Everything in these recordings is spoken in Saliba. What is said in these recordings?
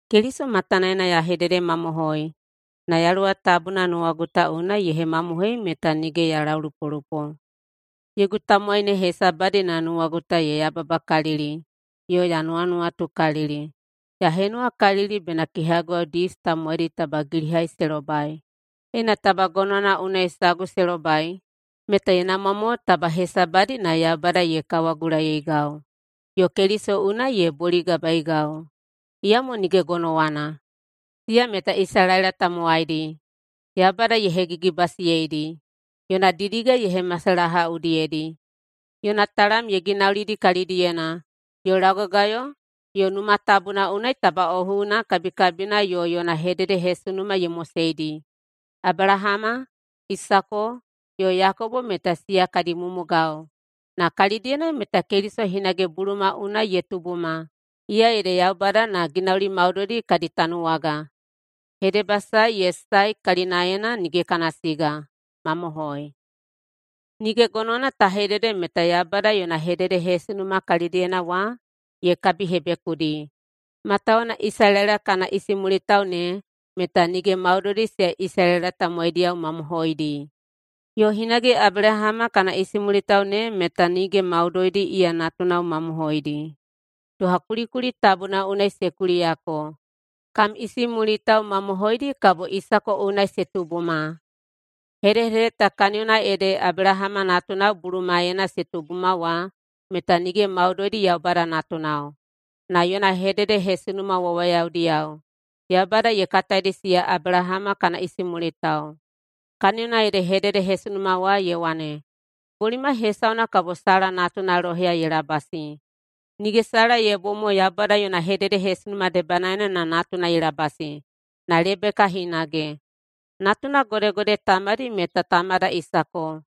Keliso matanaena ya hededemamohoi, na Yaluwa Tabuna nuwagu ta unai ye hemamohoiyei meta nige ya laulupolupo: Yogu tamowai ne hesabadi na nuwagu ta ye yababakalili yo ya nuwanuwatukalili. Ya henuwakalili bena kehaguwao Dius tamowaidi taba gilihai se lobai. Ena taba gonowana unai sagu se lobai, meta ye namwa mo taba hesabadi na Yaubada ye kawagulaiyeigau yo Keliso unai ye boligabaeigau. Iyamo nige gonowana. Siya meta Isalaela tamowaidi. Yaubada ye hegigibasiyeidi. Yona didiga ye hemasalaha udiyedi. Yona talam ye ginaulidi kalidiyena yo laugagayo yo Numa Tabuna unai tabaꞌohuina kabikabina yo yona hededehesunuma ye moseidi. Abelahama, Isako, yo Yakobo meta siya kadi mumugao, na kalidiyena meta Keliso hinage buluma unai ye tubuma, iya ede Yaubada na ginauli maudoidi kadi tanuwaga. Hedebasae ye sae kalinaena nige kana siga. Mamohoi. Nige gonowana ta hedede meta Yaubada yona hededehesunuma kalidiyena wa ye kabihebekudi, matawuwuna Isalaela kana isimulitao ne meta nige maudoidi siya Isalaela tamowaidiyao mamohoidi. Yo hinage Abelahama kana isimulitao ne meta nige maudoidi iya natunao mamohoidi. Doha kulikuli tabuna unai se kuliyako, “Kam isimulitao mamohoidi kabo Isako unai se tubuma.” Hedehedede ta kaniyona ede Abelahama natunao bulumaena se tubuma wa meta nige maudoidi Yaubada natunao, na yona hededehesunuma wawayadiyao Yaubada ye kataidi siya Abelahama kana isimulitao. Kaniyona ede hededehesunuma wa ye wane, “Bolimai hesauna kabo Sala natuna loheya ye labasi.” Nige Sala ye bom mo [Yaubada yona hededehesunuma debanaena na natuna ye labasi], na Lebeka hinage. Natunao godegode tamadi meta tamada Isako.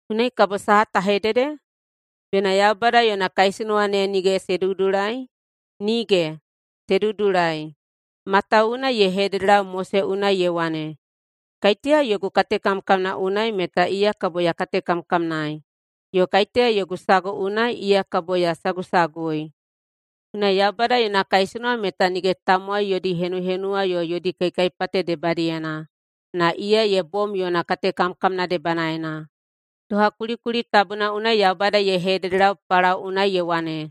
Unai kabo saha ta hedede? Bena Yaubada yona kaisunuwa ne nige se dudulai? Nige! Se dudulai! Matawuwuna ye hededelau Mose unai ye wane, “Kaiteya yogu katekamkamna unai meta iya kabo ya katekamkamnaei, yo kaiteya yogu sagu unai, iya kabo ya sagusagui.” Unai Yaubada yona kaisunuwa meta nige tamowai yodi henuhenuwa yo yodi kaikaipate debadiyena na iya ye bom yona katekamkamna debanaena. Doha kulikuli tabuna unai Yaubada ye hededelau Palao unai ye wane,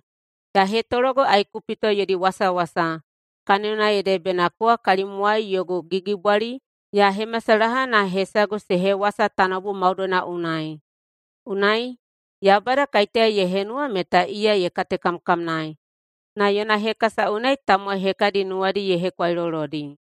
“Ya hetologo Aikupito yodi wasawasa, kaniyona ede bena kowa kalimwai yogu gigibwali ya hemasalaha na hesagu se hewasa tanoubu maudoina unai.” Unai, Yaubada kaiteya ye henuwa meta iya ye katekamkamnaei, na yona hekasa unai tamowai hekadi nuwadi ye hekwailolodi.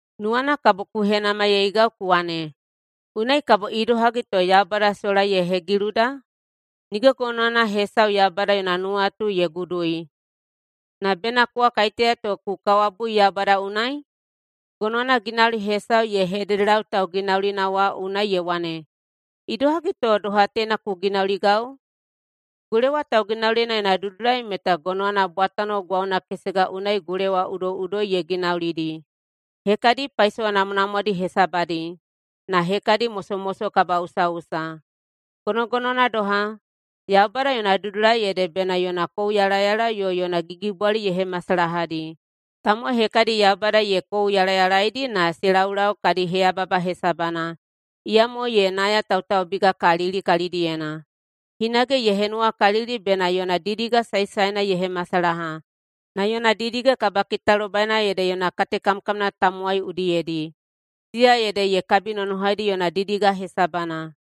Nuwana kabo ku henamaiyeigau ku wane, “Unai kabo idohagi to Yaubada sola ye hegiluda? Nige gonowana hesau Yaubada yona nuwatu ye gudui!” Na bena kowa kaiteya to ku kawabui Yaubada unai? “Gonowana ginauli hesau ye hededelau tauginaulina wa unai ye wane, ‘Idohagi to doha teina ku ginauligau?’” Gulewa tauginaulina yona dudulai meta gonowana bwatano gwauna kesega unai gulewa udoiꞌudoi ye ginaulidi, hekadi paisowa namwanamwadi hesabadi na hekadi mosomoso kabaꞌusaꞌusa. Gonogonowana doha, Yaubada yona dudulai ede bena yona kouyalayala yo yona gigibwali ye hemasalahadi. Tamowai hekadi Yaubada ye kouyalayalaidi na se laulau kadi heyababa hesabana. Iyamo ye nayatautaubigakalili kalidiyena. Hinage ye henuwakalili bena yona didiga saesaena ye hemasalaha, na yona didiga kabakitalobaina ede yona katekamkamna tamowai udiyedi, siya ede ye kabinonohaidi yona didiga hesabana.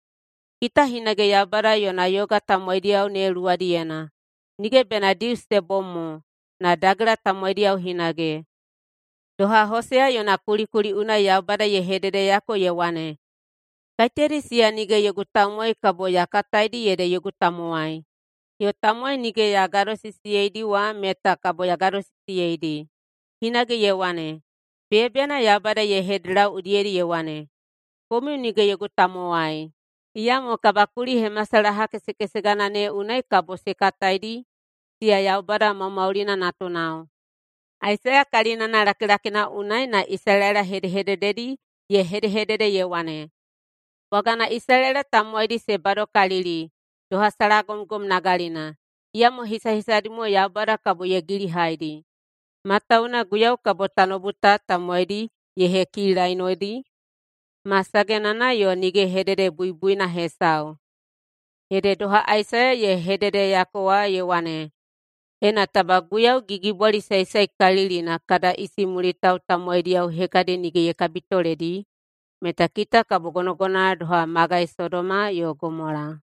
Kita hinage Yaubada yona yoga tamowaidiyao ne luwadiyena, nige bena Dius se bom mo, na Dagela tamowaidi hinage. Doha Hoseya yona kulikuli unai Yaubada ye hededeyako ye wane, “Kaiteyadi siya nige yogu tamowai kabo ya kataidi ede yogu tamowai, yo tamowai nige ya gadosisiyeidi wa meta kabo ya gadosisiyeidi.” Hinage ye wane, “Beyabeyana Yaubada ye hededelau udiyedi ye wane, ‘Komiu nige yogu tamowai!’, iyamo kabakulihemasalaha kesekesegana ne unai kabo se kataidi siya Yaubada maumaulina natunao.” Aisaiya kalinana lakilakina unai na Isalaela hedehedededi ye hedehedede ye wane, “Bwagana Isalaela tamowaidi se badokalili doha salagomgom nagalina, iyamo hisahisadi mo Yaubada kabo ye gilihaidi. Matawuwuna Guiyau kabo tanoubu ta tamowaidi ye hekilainodi ma sagenana yo nige hededebuibuina hesau.” Ede doha Aisaiya ye hededeyako wa ye wane, “Ena taba Guiyau Gigibwali Saesaekalilina kada isimulitao tamowaidiyao hekadi nige ye kabitoledi meta kita kabo gonogonowana doha magai Sodoma yo Gomola.”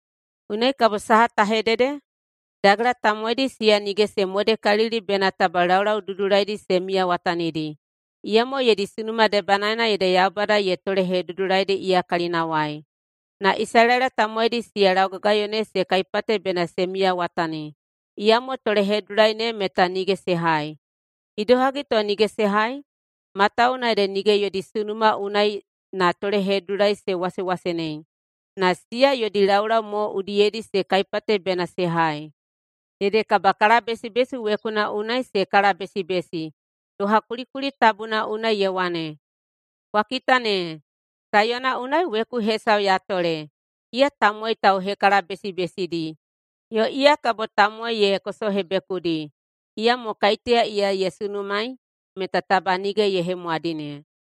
Unai kabo saha ta hedede? Dagela tamowaidi siya nige se modekalili bena taba laulau dudulaidi se miyawatanidi, iyamo yodi sunuma debanaena ede Yaubada ye tolehedudulaidi iya kalinawai. Na Isalaela tamowaidi siya laugagayo ne se kaipate bena se miyawatawatani, iyamo tolehedudulai ne meta nige se hai. Idohagi to nige se hai? Matawuwuna ede nige yodi sunuma unai na tolehedudulai se wasewasenei, na siya yodi laulau mo udiyedi se kaipate bena se hai. Ede kabakalabesibesi wekuna unai se kalabesibesi, doha kulikuli tabuna unai ye wane, “Kwa kita ne, Saiyona unai weku hesau ya tole iya tamowai tauhekalabesibesidi yo iya kabo tamowai ye kosohebekudi. Iyamo kaiteya iya ye sunumaei meta taba nige ye hemwadine.”